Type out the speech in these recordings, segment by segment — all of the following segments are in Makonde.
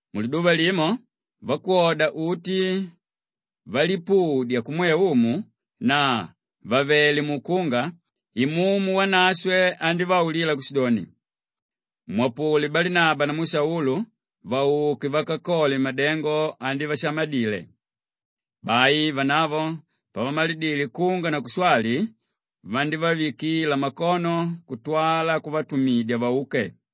Muliduva limo vakwoda uti valipudya kumwe Umu na vàvele mukunga, Imumu Wanashwe andívaulila kushidoni, “Mwapule Balinaba namu Saulu vauke vakakole madengo anivashamadile.” Bai vanavo pavamalidile kunga na kushwali, vandívavikila makono kutwala kuvatumidya vauke.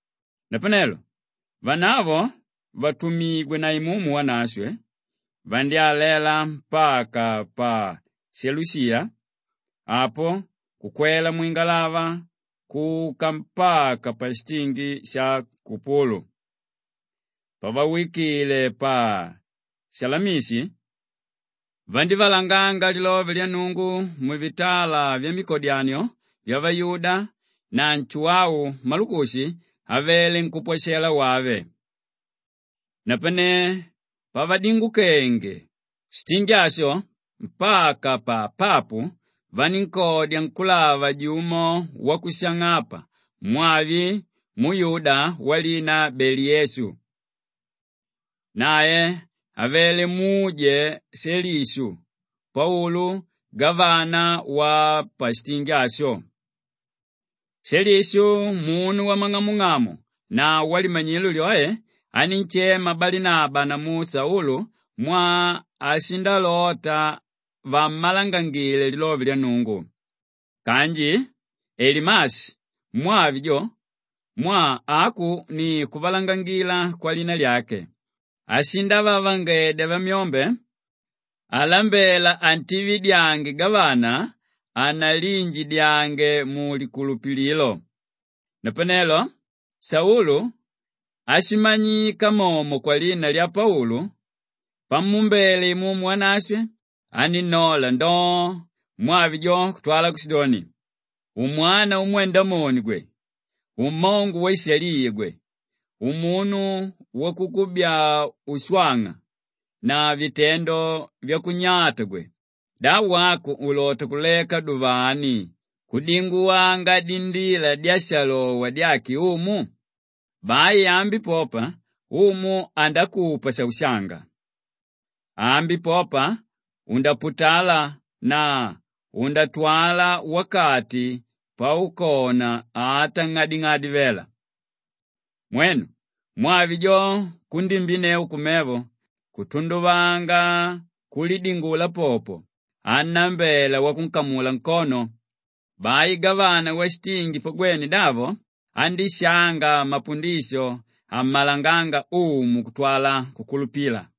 Napanelo vanavo vàtumigwe na Imumu Wanashwe, vandyálela mpaka pa Selushiya, apo kukwela mwingalava kuka mpaka pashitingi sha Kupulu. Pavawikile pa Salamishi, vandívalanganga lilove lya Nnungu muvitala vyamikodyanio vyavayuda na Nshuwau Malukushi avele nkúpwashela wave. Napane pavadingukenge shitingi asho mpaka pa Papu vanínkodya nkúlava jumo wakushang'apa mwavi muyuda walina Bali-Yesu. Nae avele muje Shelishu Paulu gavana wapashitingi asho. Shelishu, munu wamang'amung'amu na walimanyilo lyoe, anínshema Balinaba namu Saulu mwaa ashindalota vammalangangile lilove lya Nnungu. Kanji Elimashi mwavi jo, mwaa aku ni kuvalangangila kwalina lyake, ashindavavangedya vamyombe alambela antividyange gavana hanaliinjidyange mulikulupililo. Napanelo Saulu áshimanyika momo kwalina lya Paulu, pamuumbele Imumu Wanashwe anínnola ndoo, mwavi jo kutwala kushidoni, “Umwana umwe Ndamoni gwe! Ummongo waishaliya gwe! Umunu wakukubyaa ushwang'a na vitendo vyakunyata gwe! Da wako ulota kuleka duvani kudinguwanga dindila dyashalowa dyake Umu? Bai ambi popa Umu andakupa shaushanga! Ambi popa undaputala na undatwala wakati paukona ata ng'ading'adi vela.” Mwenu, mwavi jo kundimbinneu kumevo, kutunduvanga kulidingula popo annambela wakunkamula nkono. Bai gavana washitingi pagwene davo, andíshanga mapundisho ammalanganga Umu kutwala kukulupila.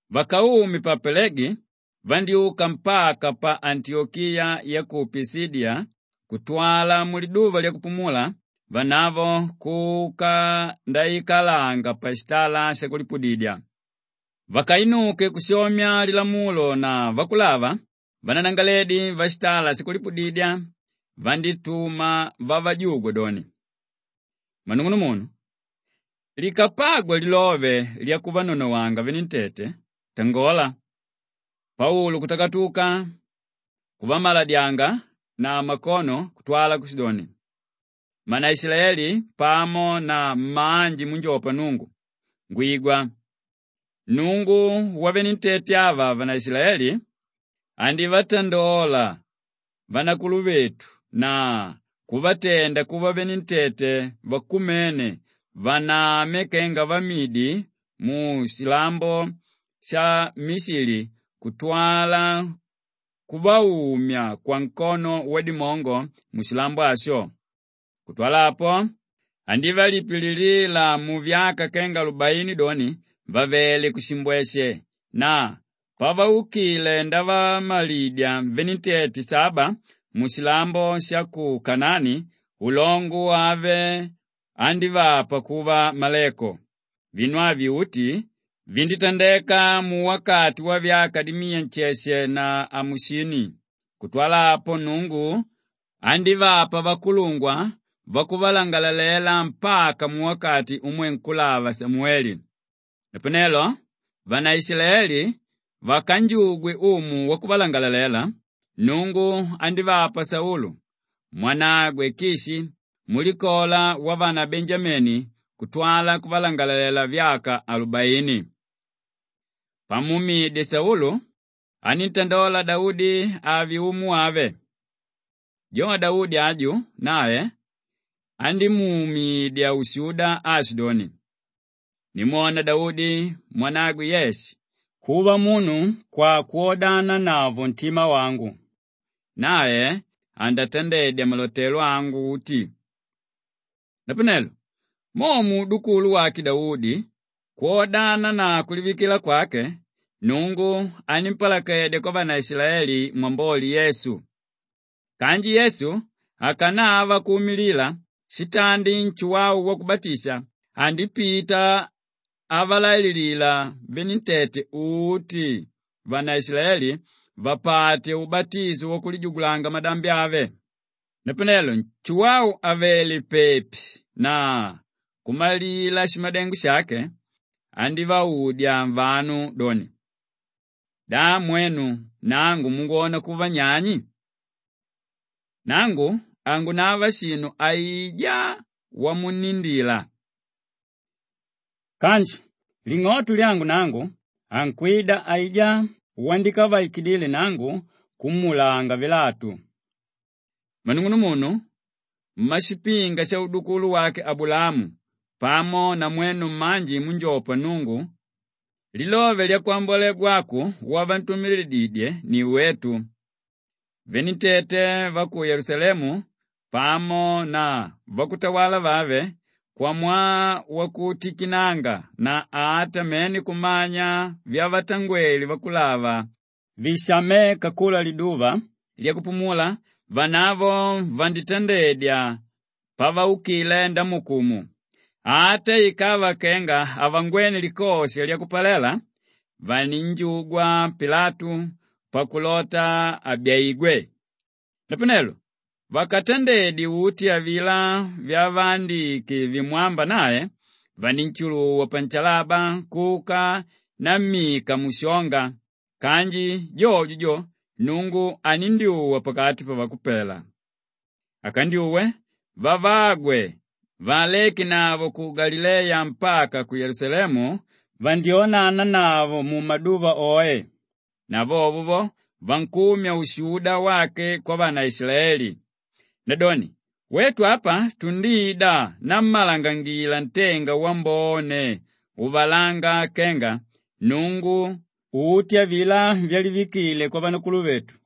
Vakaume pa Palegi vandyúka mpaka pa Antiyokiya ya ku Pishidiya kutwala muliduva lyakupumula vanavo kuka ndaikalanga pashitala shakulipudidya. Vakainuke kushomya Lilamulo na Vakulava, vananangalaledi vashitala shakulipudidya vandítuma vavajugwe doni, “Mmanung'unumunu, likapagwa lilove lyakuvanonowanga venentete, tangola.” Paulu kutakatuka kuvamaladyanga na makono kutwala kushidoni, “Mmanaishilaeli pamo na mmanji múnjopa Nnungu, ngwigwa! Nnungu wavenentete ava vavanaishilaeli andívatandola vanakuluvetu na kuvatenda kuva venentete vakumene vanama kenga vamidi mushilambo sha Mishili kutwala kuvaumya kwankono wadimongo mushilambo asho. Kutwala apo, andivapililila muvyaka kenga alubaini doni vàvele mushimbweshe na paukile ndavamalidya venentete saba mushilambo sha ku Kanaani, ulongo wave andívapa kuva maleko. Vinu avi uti vindítandeka muwakati wavyaka dimiya nsheshe na amusini. Kutwala apo, Nnungu andívapa vakulungwa vakuvalangalalela mpaka muwakati umwe nkúlava Samuwele. Napanelo vanaishilaeli vakanjugwe umu wakuvalangalalela, Nnungu andívapa Saulu mwanagwe Kishi wamulikola lyavanabenjameni kutwala kuvalangalalela vyaka alubaini. Pamuumidye Saulu, aníntandola Daudi ave umu wave. Jo Daudi aju, nae andímuumidya ushuda aashidoni, ‘Ndimwona Daudi mwanagwe Yeshe kuva munu kwakwodananavo ntima wangu; nae andatandedya malotelo angu uti.’ “Napanelo mo muudukulu wake Daudi kwodana na kulivikila kwake, Nnungu animpalakedya kwavanaishilaeli Mwamboli Yesu. Kanji Yesu akanava kuumilila, shitandi Nshuwau Wakubatisha andipita avalaililila venentete uti vanaishilaeli vapate ubatisho wakulijugulanga madambi ave. Napanelo Nshuwau àvele pepi na kumalila shimadengo shake, andívaudya vanu doni, ‘Da mwenu nangu mungwona kuva nyani? Nangu hangunava shinu aijá wamunnindila. Kanji ling'oto lyangu nangu, ankwida aijá wandikavaikidile nangu kumuulanga vilatu.’ “Mmanung'unumunu mmashipinga shaudukulu wake Abulaamu pamo na mwenu mmanji múnjopa Nnungu! Lilove lyakwambwalegwa aku, wavantumidididyé ni wetu. Venentete va ku Yelusalemu pamo na vakutawala vave kwamwaa wakuntikinanga na ata mene kumanya vyavatangwele vakulava vishaméka kula liduva lyakupumula, vanavo vanditandedya pavaukile ndamuukumu. Ata ikava kenga havangwene likosha lyakupalela, vanínjugwa Pilatu pakulota abyaigwe. Napanelo vakatandedye uti avilá vyavaandike vimwámba nae, vanínshuluwa panshalaba kuka nammika mushonga kanji jojo jo, Nnungu anindyuwa pakati pavakupela. Akandyuwe, vavagwe vaalekenavo ku Galileya mpaka ku Yelusalemu, vandyónananavo mumaduva oe na vovo vankumya ushuda wake kwavanaishilaeli. Nadoni wetu apa tundida nammalangangila ntenga wambone uvalánga kenga Nnungu uti avilá vyalivikile kwavanakuluvetu,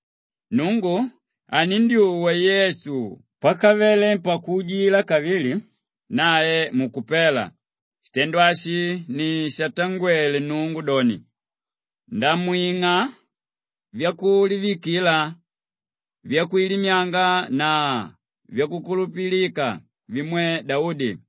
“Nnungu anindyuwa Yesu pakavele pakuujila kavili nae mukupela; shitendo ashi ni shatangwele Nnungu doni, “ ‘Ndamwing'a vyakulivikila vyakwilimyanga na vyakukulupilika vimwe Daudi.’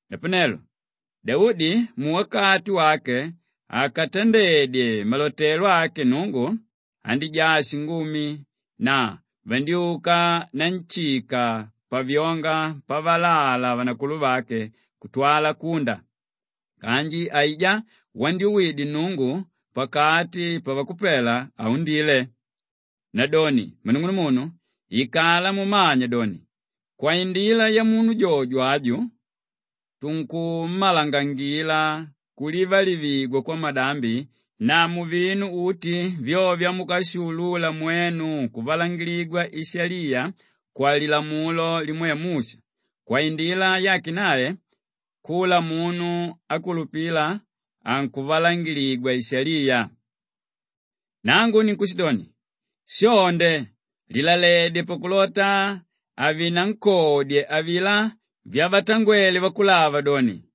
“Napanelo Daudi muwakati wake akatandedye malotelo ake Nnungu, andíjaa shingumi na vandyúka nanshika pavyonga pavalala vanakuluvake kutwala kunda kanji aijá wandyuwidye Nnungu pakati pavakupela, haundile. Nadoni mmanung'unumunu ikala mumanya doni, kwaindila yamunu jojo aju tunkummalangangila kulivalivigwa kwamadambi na muvinu uti vyo vyamukashiulula mwenu kuvalangiligwa ishaliya kwalilamulo limwe Musha kwaindila yake nae kula munu ákulupila, ankuvalangiligwa ishaliya. Nangu ninkushidoni, shonde lilaledye pakulota havinankodye avilá vyavatangwele vakulava doni,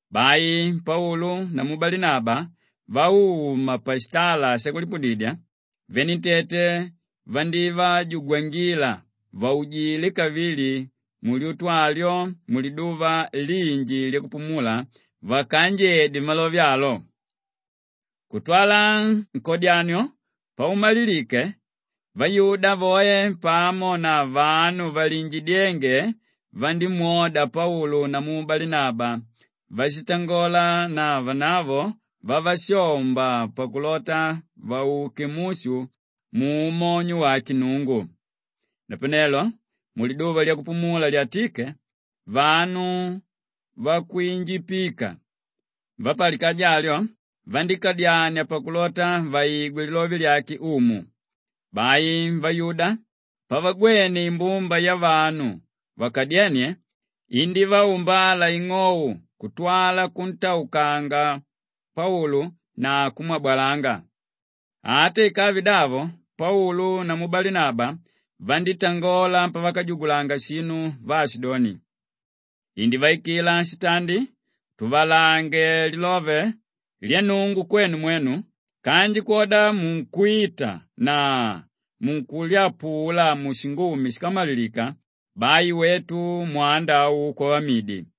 Bai Paulu namu Balinaba vauma pashitala shakulipudidya, venentete vandívajugwangila vaujile kavili mulyutu alyo muliduva linji lyakupumula vakaanjedye malove alo. Kutwala nkodyanio paumalilike, vayuda voe pamo na vanu valiinjidyénge vandímwoda Paulu namu Balinaba váshitangola na vanavo vavashomba pakulota vauke mushu muumonyo wake Nnungu. Napanelo muliduva lyakupumula lyatíke, vanu vakwinjipika vapalikaja alyo vandíkadyania pakulota vaigwe lilove lyake Umu. Bai vayuda pavagwene imbumba yavanu vakadyénie indívaumbala ing'ou kutwala kuntaukanga Paulu na kumwabalanga. Ata ikave davo Paulu namu Balinaba vandítangola pavakajugulanga shinu vaashidoni, “Indívaikila shitandi tuvalangange lilove lya Nnungu kwenu mwenu kanji kwodamwaa munkwita na munkulyapula mushingumi shíkamalilika, bai wetu mwanda au kwavamidi.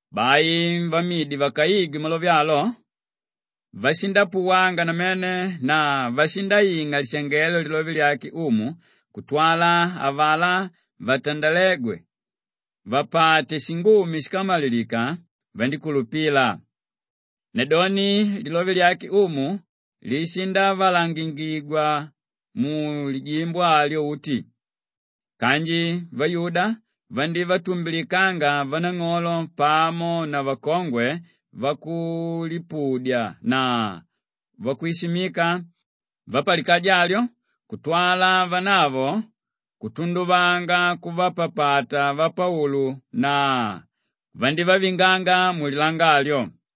Bai vamidi vakaigwe malove alo, vashindapuwanga namene na vashindaing'a lishangelo lilove lyake Umu; kutwala avalá vatandalégwe vapate shingumi shíkamalilika, vandíkulupila. Nadoni lilove lyake Umu lishindavalangangika mulijimbo alyo uti. Kanji vayuda vandívatumbilikanga vanang'olo pamo na vakongwe vakulipudya na vakwishimika vapalikaja alyo kutwala vanavo kutunduvanga kuvapapata vapaulu na vandívavinganga mulilanga alyo.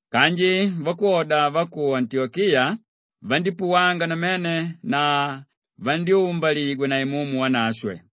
Kanji vakwoda va ku Antiyokiya vandípuwanga namene na vandyúmbaligwa na Imumu Wanashwe.